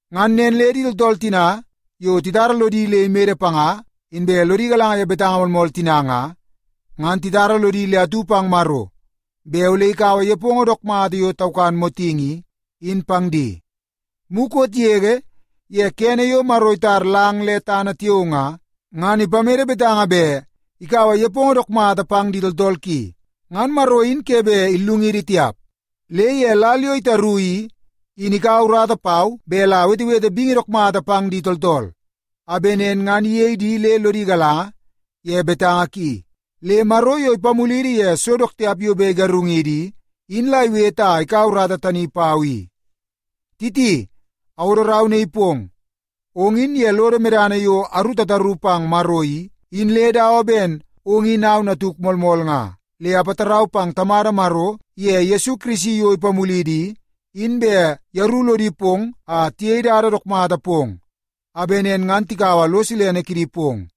Ngan nen le di tooltool tina yo titara lodi le imede panga inbe lodi galanga ye betanga moolmool tina nga, ngan titara lodi le atu pang Maro bet ole ikaua nepongo dook mata yo taukan motingi i, in pang di. Mukot yege ye kene yo Maro itar lang le tana tiao nga, ngan ipamede betanga bet ikaua nepongo dook mata pang di tooltool ki. Ngan Maro in ke bet illungidi tiap. Le ye lal yo itaru i, in ikaua urata pau bet la awetewete bingi dook mata pang di tooltool a bet nen ngan iyei di le lodi galanga ye betanga ki. Le Maro yo ipamulidi ye so dook tiap yo bet igarungidi i, in la iwete a ikaua urata tani pau i. Titi, awodo rau naii pong. Ong in ye lodo medana yo aru tataru pang Maro i, in le dawa ben ong in au natuk moolmool nga. Le apatarau pang Tamada Maro iye Yesu Kirisi yo ipamulidi i, in bet yeru lodi pong a tiyei dada dook mata pong a bet nen ngan tikaua lo silene kidi pong.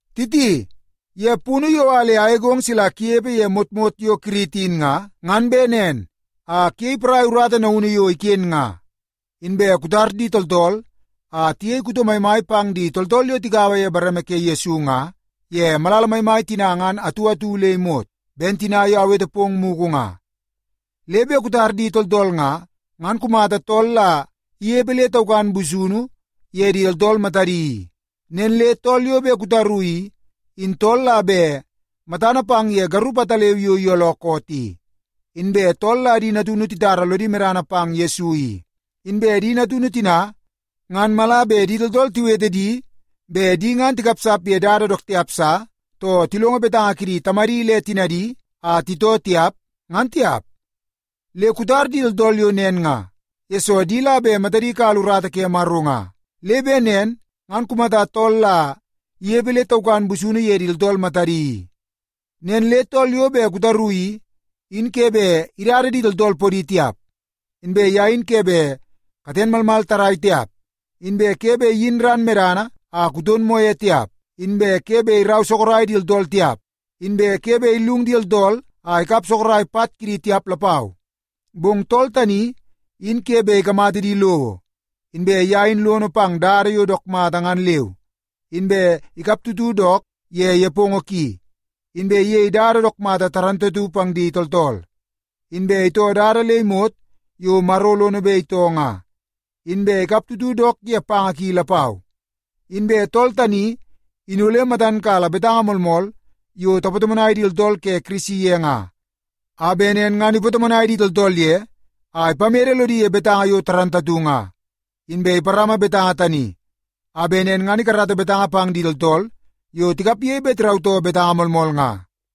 Titi, ye punu yo a le agegong sila kunepe ye motmot yo Kirit in nga, ngan bet nen a kuyei porai urata naunu yo iken nga, inbe kutar di tooltool a tiyei kuto maimai pang di tooltool yo tigaua ye bareme ke Yesu nga ye malala maimai tina ngan atu atu le imot, ben tina yo awete pong mugu nga. Le bet kutar di tooltool nga, ngan kumata tool la inepe le taukan busunu ye di tooltool matadi i. Nen le tool yo bet kutaru i, in tool la bet matana pang ye garup ataleu yo iyooloo koot i, inbe tool la di natunu titara lodi medana pang Yesu i. Inbe di natunu tina ngan mala bet di tooltool tiwete di bet di ngan tikapsap ye dada dook tiap sa, too tilongo betanga kidi tamadi le tinadi a titoo tiap, ngan tiap. Le kutar di tooltool yo nen nga, yesoo di la bet matadi kala urata ke Maro nga. Le bet nen ngan kumata tool la inepe le taukan busunu ye di tooltool matadi i. Nen le tool yo bet kutaru i, in ke bet idada di tooltool podi tiap, inbe ye in ke bet katen malmal tarrai tiap, inbe ke bet iyin ran medana a kuton moo ye tiap, inbe ke bet irau sorok di tooltool tiap, inbe ke bet illung di tooltool a ikap sorok pat kidi tiap lapau. Bong tool tani in ke bet ikamata di lowo, inbe ye in lono pang dada yo dook mata ngan leu, inbe ikaptutu dook ye nepongo ki, inbe iyei dada dook mata pang di tooltool, inbe itoo dada le imot yo Maro lono bet itoo nga, inbe ikaptutu dook ye panga ki lapau. Inbe tool tani in ole matan kala betanga moolmool yo tapatomonai di tooltool ke Kirisi ye nga, a bet nen ngan ipatomonai di tooltool ye a ipamede lodi ye betanga yo moolmool nga. Inbe iparama betanga tani a bet nen ngan ikarata betanga pang di tooltool yo tikapge bet tirautoo betanga moolmool nga.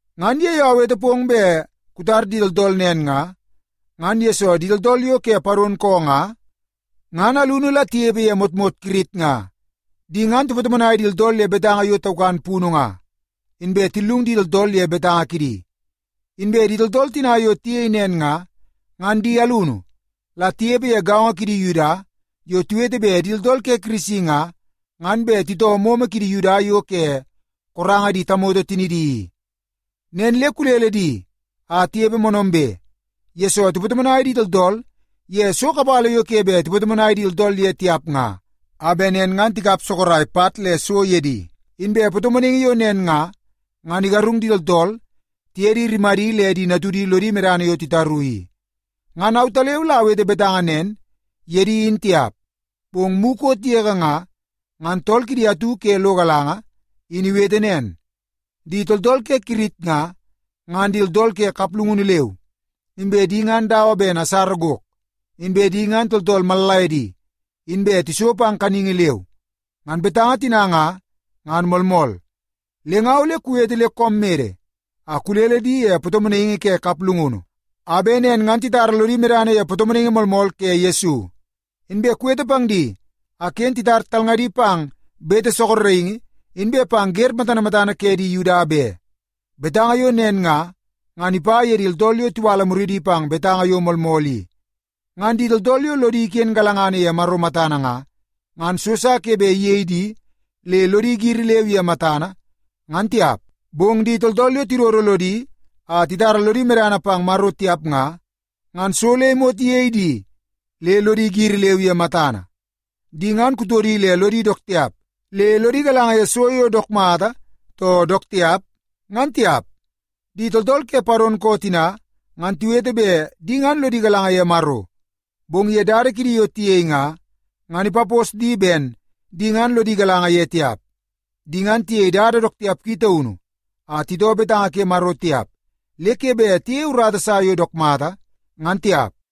Ngan ye yo awete pong bet kutar di tooltool nen nga, ngan yesoo di tooltool yo ke sak koo nga, ngan alunu la tinepe ye motmot Kirit nga. Di ngan tipatomonai di tooltool ye betanga yo taukan punu nga, inbe tillung di tooltool ye betanga kidi. Inbe di tooltool tina yo tiyei nen nga, ngan di alunu la tinepe ye gaongo kidi Yuda yo tiwete bet di tooltool ke Kirisi nga, ngan bet titoo momo kidi Yuda yo ke koranga di tamoto tinidi i. Nen le kulele di a tinepe moonoombe, yesoo tipatomonai di tooltool ye so kapala yo ke bet tipatomonai di tooltool ye tiap nga a bet nen ngan tikap sorok pat le so ye di. Inbe patomonaingi yo nen nga, ngan igarung di tooltool tiye di rimadi le di natudi lodi medana yo titaru i. Ngan autaleu la awete betanga nen ye di in tiap, bong mukot yege nga, ngan tool kidi atu ke lo galanga in iwete nen, “Di tooltool ke Kirit nga, ngan di tooltool ke kaplungunu leu, inbe di ngan dawa ben asara gok, inbe di ngan tooltool mallaiedi, inbe tiso pang kaningi leu.” Ngan betanga tina nga, ngan moolmool. Le nga ole kuwete le koom mede a kulele di ye patomonaingi ke kaplungunu, a bet nen ngan titara lodi medana ye patomonaingi moolmool ke Yesu. Inbe kuwete pang di a ken titar talngadi pang bete sorokingi inbe pang wer matana matana ke di Yuda be. Betanga yo nen nga, ngan ipa ye di tooltool yo tiwala muridi pang betanga yo moolmool i. Ngan di tooltool yo lodi iken galangana ye Maro matana nga, ngan so sa ke bet iyei di le lodi giri leu ye matana, ngan tiap. Bong di tooltool yo tidodo lodi a titara lodi medana pang Maro tiap nga, ngan so le imot iyei di le lodi giri leu ye matana. Di ngan kutodi le lodi dook tiap le lodi galanga ye so yo dook mata too dook tiap, ngan tiap. Di tooltool ke sak koo tina, ngan tiwete bet di ngan lodi galanga ye Maro, bong ye dada kidi yo tiyei nga, ngan ipapos di ben di ngan lodi galanga ye tiap. Di ngan tiyei dada dook tiap ki taunu a titoo betanga ke Maro tiap le ke bet tiyeie urata sa yo dook mata, ngan tiap.